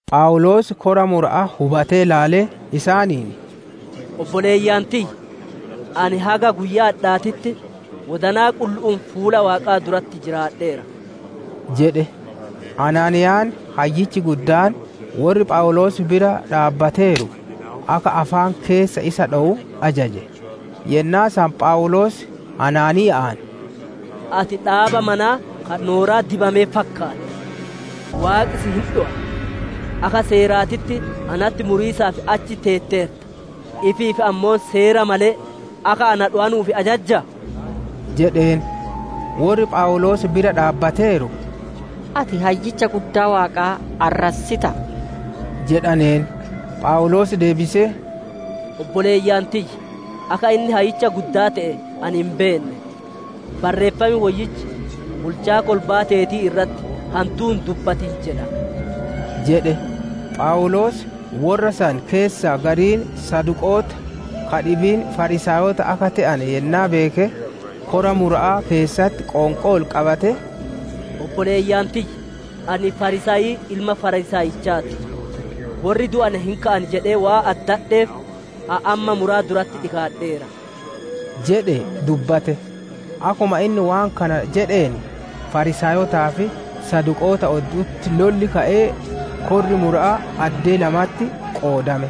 Phawuloos kora mura'aa hubatee ilaalee isaaniin, «Obboleeyyan tiyya! Ani haga guyyaa adhaatitti, wodanaa qullu'uun fuula Waaqaa duratti jiraadheera» jedhe. Anaaniyaan Hayyichi Guddaan, worri Phawuloos bira dhaabbateeru, akka afaan keessa isa dhowu ajaje. Yennaa san Phawuloos Anaaniya'aan, «Ati dhaaba manaa ka nooraa dibame fakkaatta! Waaqi si'i hin dhowa! Akka seeraatitti natti muriisaaf achi teetteerta, ifiif ammoo seera malee, akka na dhowanuuf ajajjaa?» jedheen. Worri Phawuloos bira dhaabbateeru, «Ati Hayyicha Guddaa Waaqaa arrassitaa?» jedhaneen. Phawuloos deebisee, «Obboleeyyan tiyya, akka inni Hayyicha Guddaa te'e ani hin beenne. Barreeffam Woyyichi, ‹Bulchaa kolbaa teetii irratti hantuu hin dubbatin› jedha» jedhe. Phawuloos worra san keessaa gariin Saduqoota, ka dhibiin Fariisaayota akka te'ane yennaa beeke, kora mura'aa keessatti qoonqoo ol qabatee, «Obboleeyyan tiyya! Ani Fariisaayii ilma Fariisaayichaa ti. Worri du'ane hin ka'an jedhee waan addadheef, ani amma muraa duratti dhikaadheera» jedhee dubbate. Akkuma inni waan kana jedheen, Fariisaayotaa fi Saduqoota oddu'utti lolli ka'ee, korri mura'aa addee lamatti qoodame.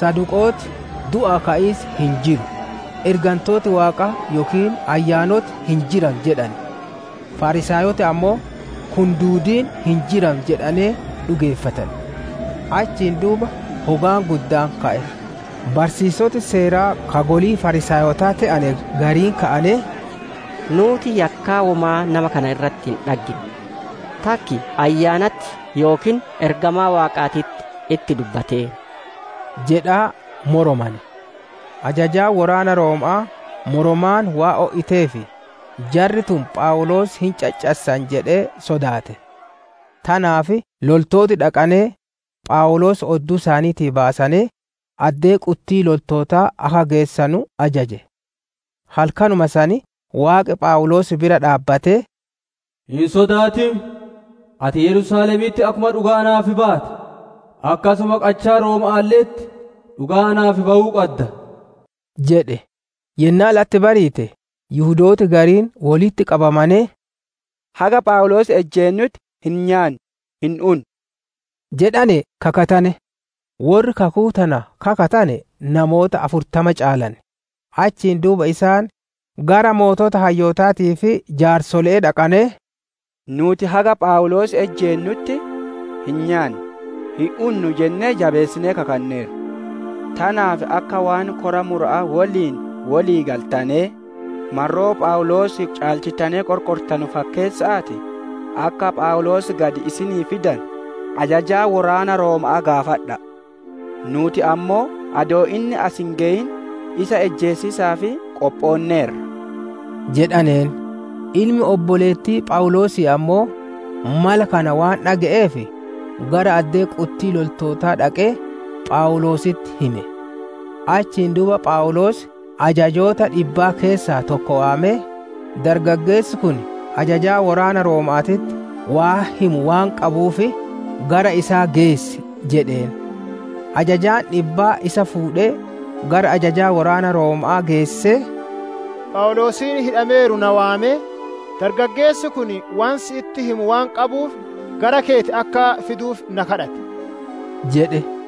Saduqooti, «Du'aa ka'iis hin jiru, ergantooti Waaqaa yookiin ayyaanoti hin jiranu» jedhan; Fariisaayoti ammoo, «Kun duudiin hin jiran» jedhanee dhugeeffatan. Achiin duuba hogaan guddaan ka'e; barsiisoti Seeraa ka golii Fariisaayotaa te'ane gariin ka'anee, «Nuuti yakkaa womaa nama kana irratti hin dhaggine! Takki ayyaanatti yookiin ergamaa Waaqaatitti itti dubbateera!» jedhaa moromane. Ajajaan woraana Rooma'aa moromaan waan o'iteef, jarri tun Phawuloos hin caccassan jedhee sodaate. Tanaaf loltooti dhaqanee, Phawuloos odduu isaaniitii baasanee, addee quttii loltootaa akka geessanu ajaje. Halkanuma san Waaqi Phawuloos bira dhaabbatee, «Hin sodaatin! Ati Yerusaalemitti akkuma dhugaa naaf baate, akkasuma qachaa Rooma'aalle'etti dhugaa naaf bawuu qadda» jedhe. Yennaa latti bariite Yihudooti gariin wolitti qabamanee, «Haga Phawuloos ijjeennutti hin nyaannu, hin unnu» jedhanee kakatane. Worri kakuu tana kakatane namoota afurtama caalan. Achiin duuba isaan gara sooreyyii hayyootaatii fi jaarsole'ee dhaqanee, «Nuuti haga Phawuloos ijjeennutti, hin nyaannu, hin unnu jennee jabeessinee kakanneerra. Tanaaf akka waan kora mura'aa woliin wolii galtanee, marroo Phawuloosii caalchittanee qorqortanuu fakkeessa'aatii, akka Phawuloos gadi isinii fidanu, ajajaa woraana Rooma'aa gaafadha'a. Nuuti ammoo adoo inni as hin geyin, isa ijjeesiisaaf qophoonneerra» jedhaneen. Ilmi obboleettii Phawuloosii ammoo, mala kana waan dhage'eef, gara addee quttii loltootaa dhaqee, Phawuloositti hime. Achiin duuba Phawuloos ajajjoota dhibbaa keessaa tokko waamee, «Dargaggeessi kun ajajaa woraana Rooma'aatitti waan himu waan qabuuf, gara isaa geessi» jedheen. Ajajaan dhibbaa isa fuudhee, gara ajajaa woraana Rooma'aa geessee, «Phawuloosiin hidhameeru na waamee, dargaggeessi kun waan sitti himu waan qabuuf, gara keeti akka fiduuf na gaafate» jedhe.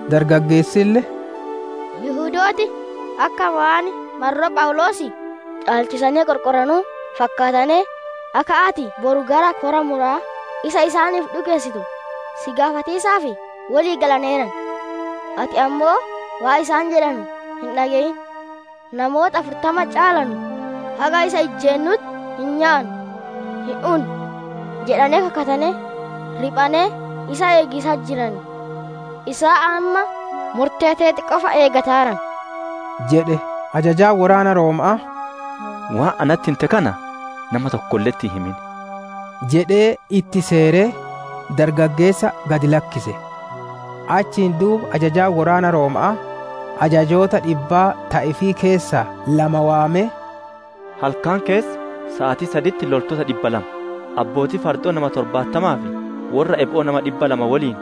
Dargaggeessille, «Yihudooti akka waan marroo Phawuloosii caalchisanee qorqoranuu fakkaatanee, akka ati boru gara kora mura'aa isa isaaniif dhikeessitu, si gaafatiisaaf wolii galaneeran. Ati ammoo waan isaan jedhanu hin dhage'in. Namooti afurtama caalanu, haga isa ijjeennutti hin nyaannu, hin unnu jedhanee kakatanee, riphanee isa eegiisatti jiran. Isaan amma murtee teeti qofa eegataaran» jedhe. Ajajaan woraana Rooma'aa, «Waan natti hinte kana nama tokkolle'etti hin himin» jedhee itti seeree, dargaggeessa gad lakkise. Achiin duuba ajajaan woraana Rooma'aa, ajajjoota dhibbaa ta ifii keessaa lama waamee, «Halkan keessa saatii saditti loltoota dhibba lama, abbootii fardo'oo nama torbaatamaa fi worra ebo'oo nama dhibba lama woliin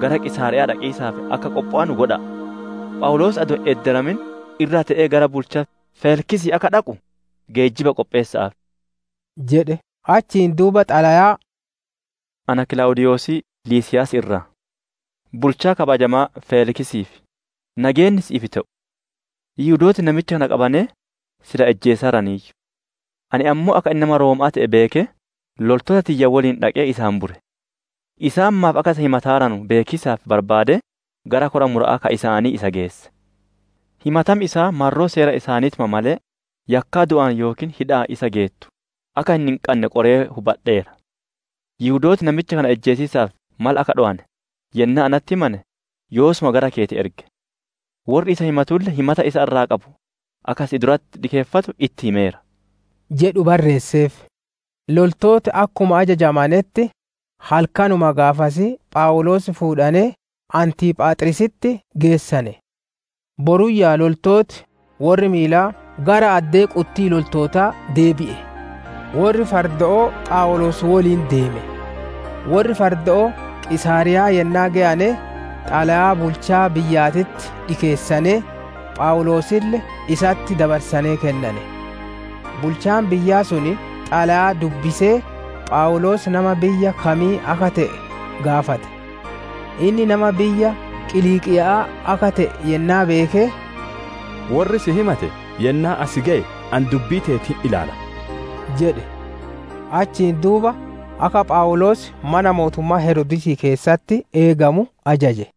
gara Qiisaariya'aa dhaqiisaaf akka qophowanu godha'a. Phawuloos adoo hin edderamin irra tee'ee gara bulchaa Feeliksii akka dhaqu, geejjiba qopheessa'aaf» jedhe. Achiin duuba xalayaa, «Ana Kilaawudiiyosii Liisiiyaasii irraa, bulchaa kabajamaa Feeliksiif! Nageenni si'iif te'u. Yihudooti namicha kana qabanee, silaa ijjeesaaraniiyyu. Ani ammoo akka inni nama Rooma'aa te'e beekee, loltoota tiyya woliin dhaqee isa hambure. Isaan maaf akka isa himataaranu beekiisaaf barbaadee, gara kora mura'aa ka isaanii isa geesse. Himatam isaa marroo seera isaaniituma malee, yakkaa du'aan yookiin hidha'aan isa geettu, akka inni hin qanne qorqoree hubadheera. Yihudooti namicha kana ijjeesiisaaf mala akka dhowane, yennaa natti himame, yoosuma gara keeti erge. Worri isa himatulle, himata isa irraa qabu akka si duratti dhikeeffatu itti himeera» jedhu barreesseef. Loltooti akkuma ajajamanetti, halkanuma gaafasii Phawuloos fuudhanee Antiiphaaxriisitti geessane. Boruyyaa loltooti worri miilaa gara addee quttii loltootaa deebi'e; worri fardo'oo Phawuloos woliin deeme. Worri fardo'oo Qiisaariyaa yennaa geyane, xalayaa bulchaa biyyaatitti dhikeessanee, Phawuloosille isatti dabarsanee kennane. Bulchaan biyyaa sun xalayaa dubbisee, Phawuloos nama biyya kamii akka te'e gaafate. Inni nama biyya Qiliiqiya'aa akka te'e yennaa beeke, «Worri si himate yennaa as geye ani dubbii teeti hin ilaala» jedhe. Achiin duuba akka Phawuloos mana mootummaa Heroodisii keessatti eegamu ajaje.